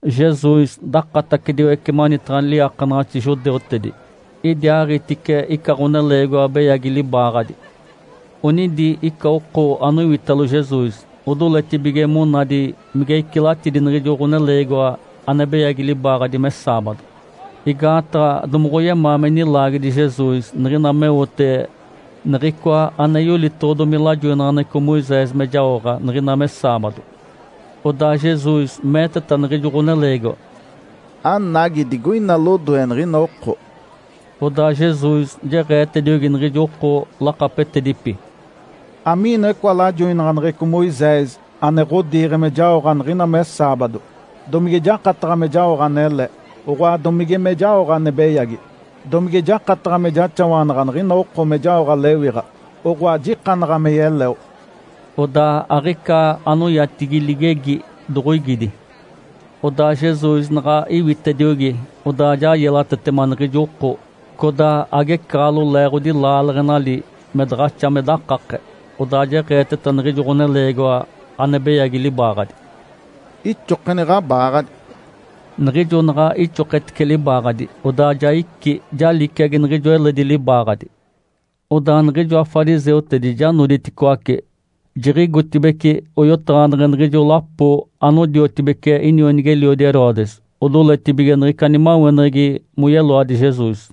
Jesus dakatacediwece manitaɡ̶a liiakanaɡ̶axi judeutedi. Idiaaɡ̶itice ica ɡ̶oneleegiwa beyagi libaaɡ̶adi. Onidi ica oko anoiwitalo Jesus odoletibige monadi mige icilatidi niɡ̶ijo ɡ̶oneleegiwa ane beyagi libaaɡ̶adi me saabado, igaataɡ̶a domoɡ̶oyemaa me nilaagedi Jesus niɡ̶ina meote niɡ̶icoa ane yolitoɡ̶odomi lajoinaɡ̶aneɡ̶eco Moisés me jaoɡ̶a niɡ̶ina me saabado. Odaa Jesus meeteta niɡ̶ijo ɡ̶oneleegiwa, “Anagi digoina lodoe niɡ̶ina oko!” Odaa Jesus jeɡ̶eetediogi niɡ̶ijo oko lakapetedipi, “Amiinoa icoa lajoinaɡ̶aneɡ̶eco Moisés ane ɡ̶odiiɡ̶e me jaoɡ̶a niɡ̶ina me saabado? Domige jakataɡ̶a me jaoɡ̶a anele, oɡ̶oa domige me jaoɡ̶a ane beyagi? Domige jakataɡ̶a me jaxawanaɡ̶a niɡ̶ina oko me jaoɡ̶a lewiɡ̶a, oɡ̶oa jikanaɡ̶a me yeleo?” Odaa aɡ̶ica anoyatigi ligegi doɡ̶oigidi. Odaa Jesus naɡ̶a iwitediogi, odaa ja yelatetema niɡ̶ijo oko, codaa agecaɡ̶alo leeɡ̶odi laaleɡ̶enali me daɡ̶axa me dakake. Odaa jeɡ̶eeteta niɡ̶ijo ɡ̶oneleegiwa ane beyagi libaaɡ̶adi, “Ixokeni ɡ̶abaaɡ̶adi!” Niɡ̶ijo naɡ̶a ixoketice libaaɡ̶adi, odaa ja icí, ja liciagi niɡ̶ijo eledi libaaɡ̶adi. Odaa niɡ̶ijoa fariseutedi ja noditicoaci, jiɡ̶igotibeci oyotaɡ̶aneɡ̶e niɡ̶ijo lapo anodiotibeci inionigi-eliodi Herodes. Odoletibige niɡ̶ica nimaweneɡ̶egi moyeloadi Jesus.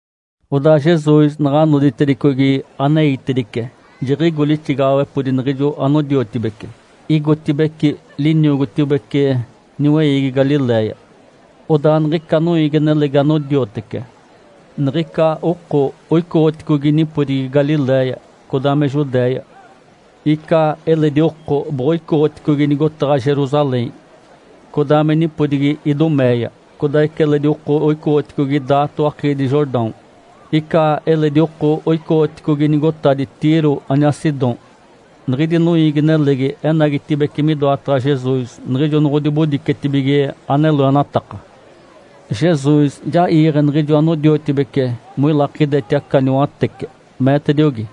Odaa Jesus naɡ̶a noditedicogi aneitedice, jiɡ̶igo lixigaɡ̶awepodi niɡ̶ijo anodiotibece, igotibeci liniogotibece niweiigi Galiléia. Odaa niɡ̶ica noiigi-nelegi anodiotece. Niɡ̶ica oko oicoɡ̶oticogi nipodigi Galiléia, codaa me Judéia. Ica eledi oko boɡ̶oicoɡ̶oticogi nigotaɡ̶a Jerusalém, codaa me nipodigi Iduméia, codaa ica eledi oko oicoɡ̶oticogi daato akiidi Jordão. Ica eledi oko oicoɡ̶oticogi nigotadi Tiro aniaa Sidom. Niɡ̶idi noiigi-nelegi enagitibeci midoataɡ̶a Jesus niɡ̶ijo noɡ̶odibodicetibige ane loenataka. Jesus ja iiɡ̶e niɡ̶ijo anodiotibece moilakideti aca niwatece, meetediogi,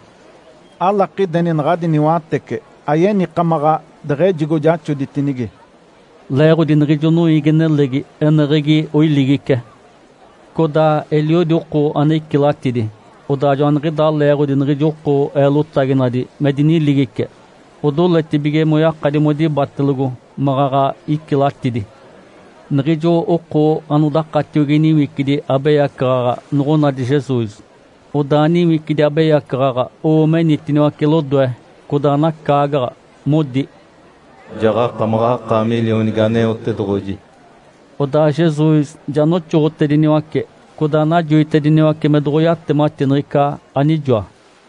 “Alakideni naɡ̶adi niwatece ayenikamaɡ̶a deɡ̶ejigo jaxoditinigi.” Leeɡ̶odi niɡ̶ijo noiigi-nelegi eneɡ̶egi oiligice. Codaa eliodi oko ane icilatidi, odaa joaniɡ̶idaa leeɡ̶odi niɡ̶ijo oko eelotaginadi me diniligice, odoletibige moyakadi modibatelogo maɡ̶aɡ̶a icilatidi. Niɡ̶ijo oko anodakatiogi niwicidi abeyacaɡ̶aɡ̶a noɡ̶onadi Jesus, odaa niwicidi abeyacaɡ̶aɡ̶a owo menitiniwace lodoe, codaa nacaagaɡ̶a, modi, “Jaɡ̶akamaɡ̶akaami Lionigi Aneotedoɡ̶oji!” Odaa Jesus ja noxoɡ̶otediniwace, codaa najoitediniwace me doɡ̶oyatemati niɡ̶ica anijoa.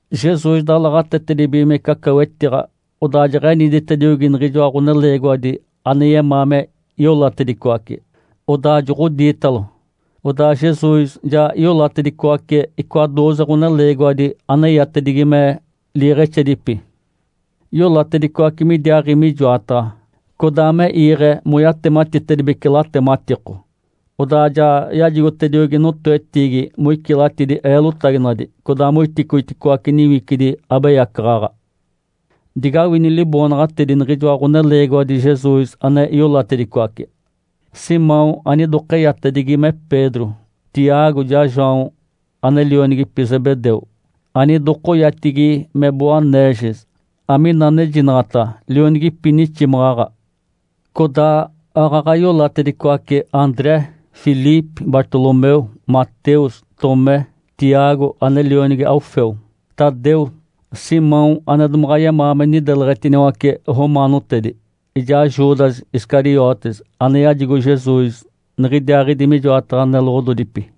Jesus dalaɡ̶atetedibigimece aca wetiɡ̶a, odaa jeɡ̶eniditediogi niɡ̶ijoa ɡ̶oneleegiwadi ane yemaa me iolatedicoace, odaa joɡ̶odiitalo. Odaa Jesus ja iolatedicoace icoa dooze ɡ̶oneleegiwadi aneyatedigi me “Iiɡ̶exedipi”. Iolatedicoace midiaaɡ̶i mijoataɡ̶a, codaa me iiɡ̶e moyatematitedibece latematiko. Odaa ja yajigotediogi notoetiigi moicilatidi eelotaginadi, codaa moiticoiticoace niwicidi abeyacaɡ̶aɡ̶a. Digawini liboonaɡ̶atedi niɡ̶ijoa ɡ̶oneleegiwadi Jesus ane iolatedicoace: Simão anidokeyatedigi me Pedro, Tiago ijaa João ane lionigipi Zebedeu anidokoyatigi me Boanerges, amina anejinaɡ̶ata, “Lionigipi niximaɡ̶aɡ̶a”. Codaa aaɡ̶aɡ̶a iolatedicoace André, Filipe, Bartolomeu, Mateus, Tomé, Tiago ane lionigi Alfeu, Tadeu, Simão ane domaɡ̶a yemaa me nideleɡ̶etiniwace romaanotedi, ijaa Judas Iscariotes ane yajigo Jesus niɡ̶idiaaɡ̶idi mijoataɡ̶a neloɡ̶ododipi.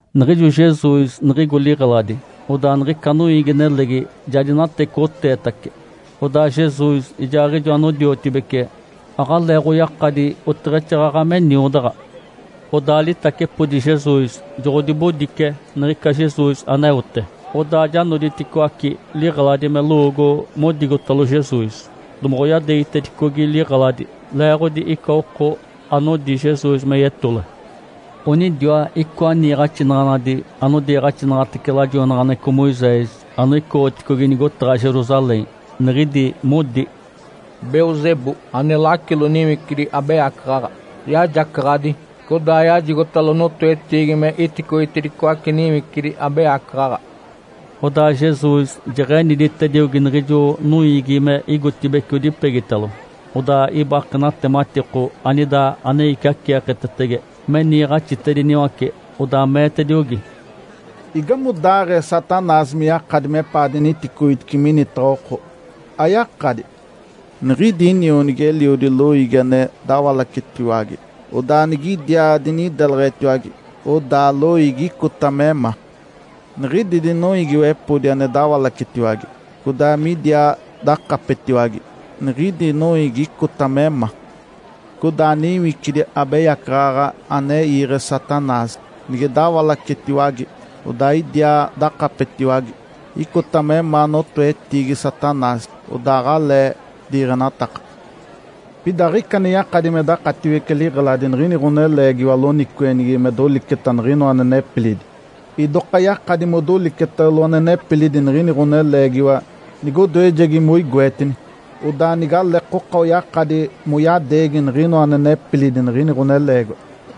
Niɡ̶ijo Jesus niɡ̶igo liɡ̶eladi, odaa niɡ̶ica noiigi-nelegi ja dinatecoɡ̶oteetace. Odaa Jesus ijaaɡ̶ijo anodiotibece aɡ̶aleeɡ̶oyakadi oteɡ̶exaaɡ̶aɡ̶a me niodaɡ̶a. Odaa litacepodi Jesus joɡ̶odibodice niɡ̶ica Jesus aneote, odaa ja noditicoaci liɡ̶eladi me lowoogo modigotalo Jesus, domoɡ̶oyadeegitedicogi liɡ̶eladi, leeɡ̶odi ica oko anodi Jesus me yetole. Onidiwa icoa niiɡ̶axinaɡ̶anadi anodiiɡ̶axinaɡ̶atece lajoinaɡ̶aneɡ̶eco Moisés anoicoɡ̶oticogi nigotaɡ̶a Jerusalém. Niɡ̶idi modi, “Belzebu, ane lacilo niwicidi abeyacaɡ̶aɡ̶a, yajacaɡ̶adi, codaa yajigotalo notoetiigi me iticoitedicoace niwicidi abeyacaɡ̶aɡ̶a.” Odaa Jesus jeɡ̶eniditediogi niɡ̶ijo noiigi me igotibeci odipegitalo, odaa ibake natematiko anida ane iciaceeketetege me niiɡ̶axitediniwace. Odaa meetediogi, “Igamodaaɡ̶ee Satanás me yakadi mepaa diniticoitice minitaɡ̶a oko? Ayakadi! Nigidi inionigi-eliodi loiigi ane dawalacetiwage, odaa nigidiaa dinideletiwage, odaa loiigi icota me ma. Nigidi dinoiigiwepodi, ane dawalacetiwage, codaa midiaa dakapetiwage, niɡ̶idi noiigi icota me ma. Codaa niwicidi abeyacaɡ̶aɡ̶a ane iiɡ̶e Satanás nige dawalacetiwage, odaa idiaa dakapetiwage, icota me ma notoetiigi Satanás, odaa aɡ̶alee diiɡ̶enataka. Pida aɡ̶ica ane yakadi me dakatiwece liɡ̶eladi niɡ̶ini ɡ̶oneleegiwa loniciweɡ̶enigi me doliceta niɡ̶inoa ane nepilidi. Idoka yakadi modolicetalo ane nepilidi niɡ̶ini ɡ̶oneleegiwa nigodoejegi moigoetini. Odaa nigaleekoka oyakadi moyadeegi niɡ̶inoa ane nepilidi niɡ̶ini ɡ̶oneleegiwa.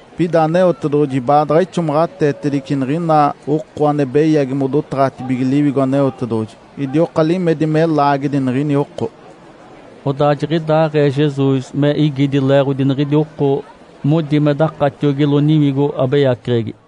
Pida Aneotedoɡ̶oji baadaɡ̶a ixomaɡ̶ateetedice niɡ̶ina oko ane beyagi modotaɡ̶atibige Liwigo Aneotedoɡ̶oji. Idioka limedi me laagedi niɡ̶ini oko.” Odaa jiɡ̶idaaɡ̶ee Jesus me igidi leeɡ̶odi niɡ̶idi oko modi me dakatiogilo niwigo abeyaceɡ̶egi.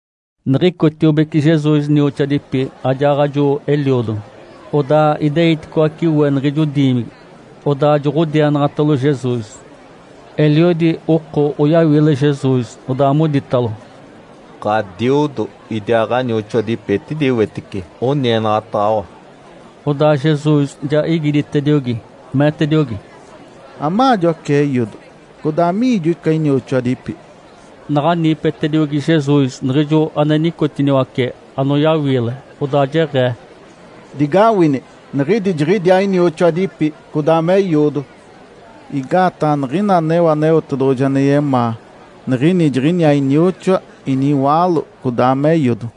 Niɡ̶icotiobeci Jesus nioxoadipi ajaaɡ̶ajo eliodo. Odaa ideiticoace we niɡ̶ijo diimigi, odaa joɡ̶odienaɡ̶atalo Jesus. Eliodi oko oyawiile Jesus, odaa moditalo, “Ǥadiodo idiaa ɡ̶anioxoadipi etidi wetice, onienaɡ̶ataɡ̶awa.” Odaa Jesus ja igiditediogi, meetediogi, “Amaajo aca eiodo? Codaa amiijo ica inioxoadipi?” Naɡ̶a niipetediogi Jesus niɡ̶ijo ane nicotiniwace anoyawiile, odaa jeɡ̶ee, “Digawini! Niɡ̶idi jiɡ̶idiaa inioxoadipi codaa me eiodo. Igaataɡ̶a niɡ̶ina aneo Aneotedoɡ̶oji ane yemaa, niɡ̶ini jiɡ̶iniaa inioxoa, iniwaalo, codaa me eiodo.”